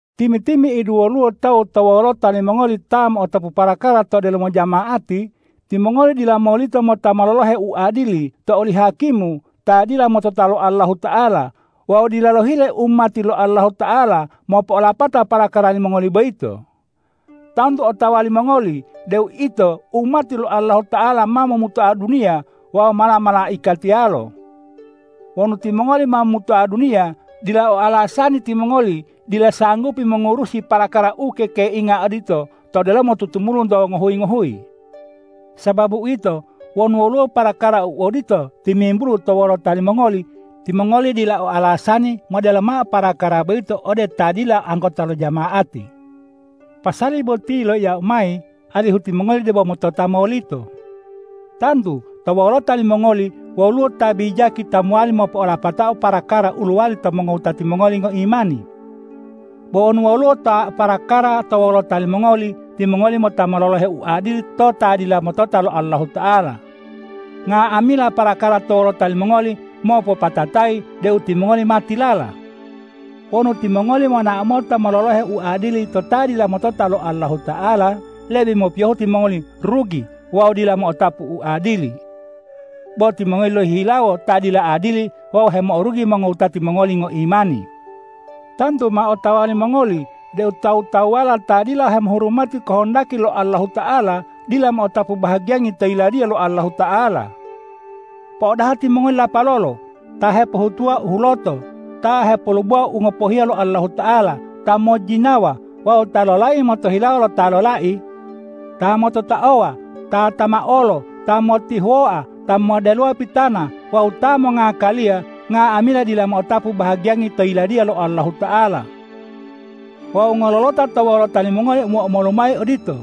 Timi-timi'idu woluwo tawu to wolota limongoli ta mo'otapu parakara to delomo jama'ati, timongoli dila molito mota mololohe uadili to oli hakimu ta dila motota lo Allahuta'ala wawu dila lohile umati lo Allahuta'ala mopo'olapata parakara limongoli boyito. Tantu otawa limongoli deu ito umati lo Allahuta'ala ma momutoa duniya wawu mala-malaikatiyalo. Wonu timongoli ma momutoa duniya, dila o alasani timongoli dila sanggupi mongurusi parakara u kekeinga odito to delomo tutumulunto ngohuyi-ngohuyi. Sababu uwito, wonu woluwo parakara u odito timimbulu to wolota limongoli, timongoli dila o alasani modelo mao parakara boyito ode ta dila anggota lo jama'ati. Pasali boti yiloiyau mayi, alihu timongoli debo motota molito. Tantu to wolota limongoli woluwo ta bijaki ta mowali mopo'olapatao parakara u lowali to mongowutati mongoli ngoimani. Bo wonu woluwo ta o parakara to wolota limongoli, timongoli mota mololohe uadili to ta dila motota lo Allahuta'ala. Nga'amila parakara to wolota limongoli mopopatatayi deu timongoli ma tilala. Wonu timongoli bo monao mota mololohe uadili to ta dila motota lo Allahuta'ala, lebe mopiyohu timongoli rugi wawu dila mo'otapu uadili. Bo timongoli lohihilawo ta dila adili wawu hemo'orugi mongowutati mongoli ngoimani. Tantu ma otawa limongoli deu tawu-tawuwala ta dila hemoturuti kohondaki lo Allahuta'ala, dila mo'otapu bahagiyangi to Yiladiya lo Allahuta'ala. Po'odaha timongoli lapalolo! Ta hepohutuwa u huloto, ta hepolubowa u ngopohiya lo Allahuta'ala, ta mojjinawa wawu ta lolai motohilawo lo ta lolai, ta mototaowa, ta tamaolo, ta motihuwoa, ta moddelowa pitana wawu ta mongakaliya, nga'amila dila mo'otapu bahagiyangi to Yiladiya lo Allahuta'ala. Wawu ngololota to wolota limongoli omo-omolu mayi odito.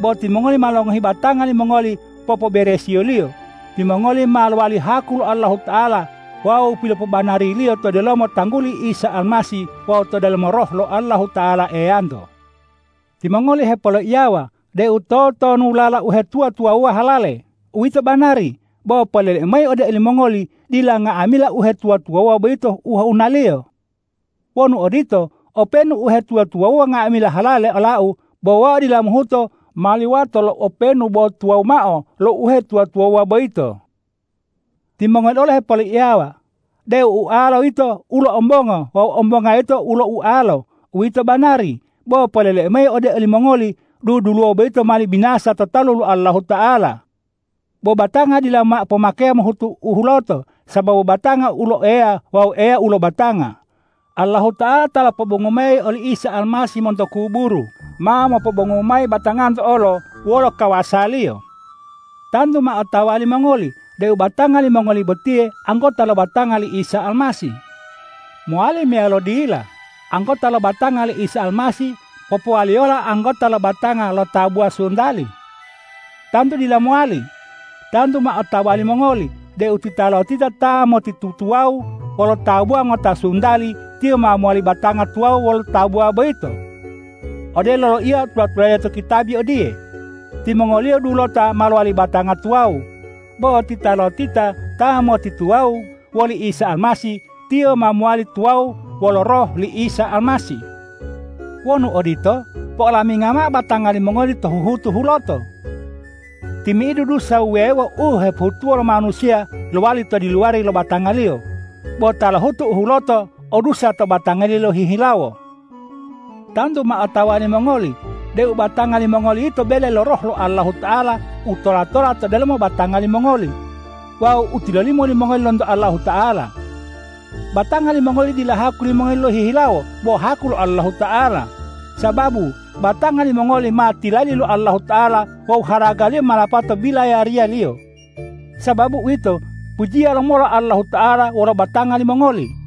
Bo timongoli ma longohi batanga limongoli popoberesiyoliyo, timongoli ma lowali haku lo Allahuta'ala wawu pilopobanari-Liyo to delomo tangguli Isa Almasih wawu to delomo Roh lo Allahuta'ala Eyanto. Timongoli hepoloiyawa deu totonulala uhetuwa-tuwawuwa halale. Uwito banari, bo poleleu mayi ode olimongoli: Dila nga'amila uhetuwa-tuwawuwa boyito ohunaliyo. Wonu odito, openu uhetuwa-tuwawuwa nga'amila halale olau, bo wau dila mohuto mali wato lo openu bo tuwawu mao lo uhetuwa-tuwawuwa boyito. Timongoli olo hepoloiyawa deu ualola yito ulo ombongo wawu ombonga yito ulo ualo. Uwito banari, bo poleleu mayi ode olimongoli: Duduluwo boyito mali binasa to talu lo Allahuta'ala. Bo batanga dila mao pomakeya mohutu u huloto, sababu batanga ulo Eya wawu Eya ulo batanga. Allahuta'ala ta lopobongu mayi oli Isa Almasih monto kuburu, ma mopobongu mayi batanganto olo wolo kawasa-Liyo. Tantu ma otawa limongoli deu batanga limongoli botiye anggota lo batanga li Isa Almasih. Mowali meyalo dila anggota lo batanga li Isa Almasih popowaliyola anggota lo batanga lo tabuwa suntali? Tantu dila mowali. Tantu ma otawa limongoli deu titalotita ta motituwawu wolo tabuwa ngota suntali, tiyo ma mowali batanga tuwawu wolo tabuwa boyito. Odelo loiya tula-tulade to kitabi odiye,”Timongoliyo dulota ma lowali batanga tuwawu.” Bo titalotita ta motituwawu woli Isa Almasih, tiyo ma mowali tuwawu wolo Roh li Isa Almasih. Wonu odito, po'olaminga mao batanga limongoli to huhutu huloto! Timi'idu dusa wuwewo u hepohutuwo lo manusiya lowali to diluwari lo batangaliyo, bo ta lohutu u huloto o dusa to batangaliyo lohihilawo. Tantu ma otawa limongoli deu batanga limongoli yito bele lo Roh lo Allahuta'ala u tola-tola to delomo batanga limongoli wawu u tilolimo limongoli lonto Allahuta'ala. Batanga limongoli dila haku limongoli lohihilawo bo haku lo Allahuta'ala, sababu batanga limongoli ma tilali lo Allahuta'ala wawu haragaliyo ma lapato bilayariya-Liyo. Sababu uwito, pujiya lomola Allahuta'ala wolo batanga limongoli!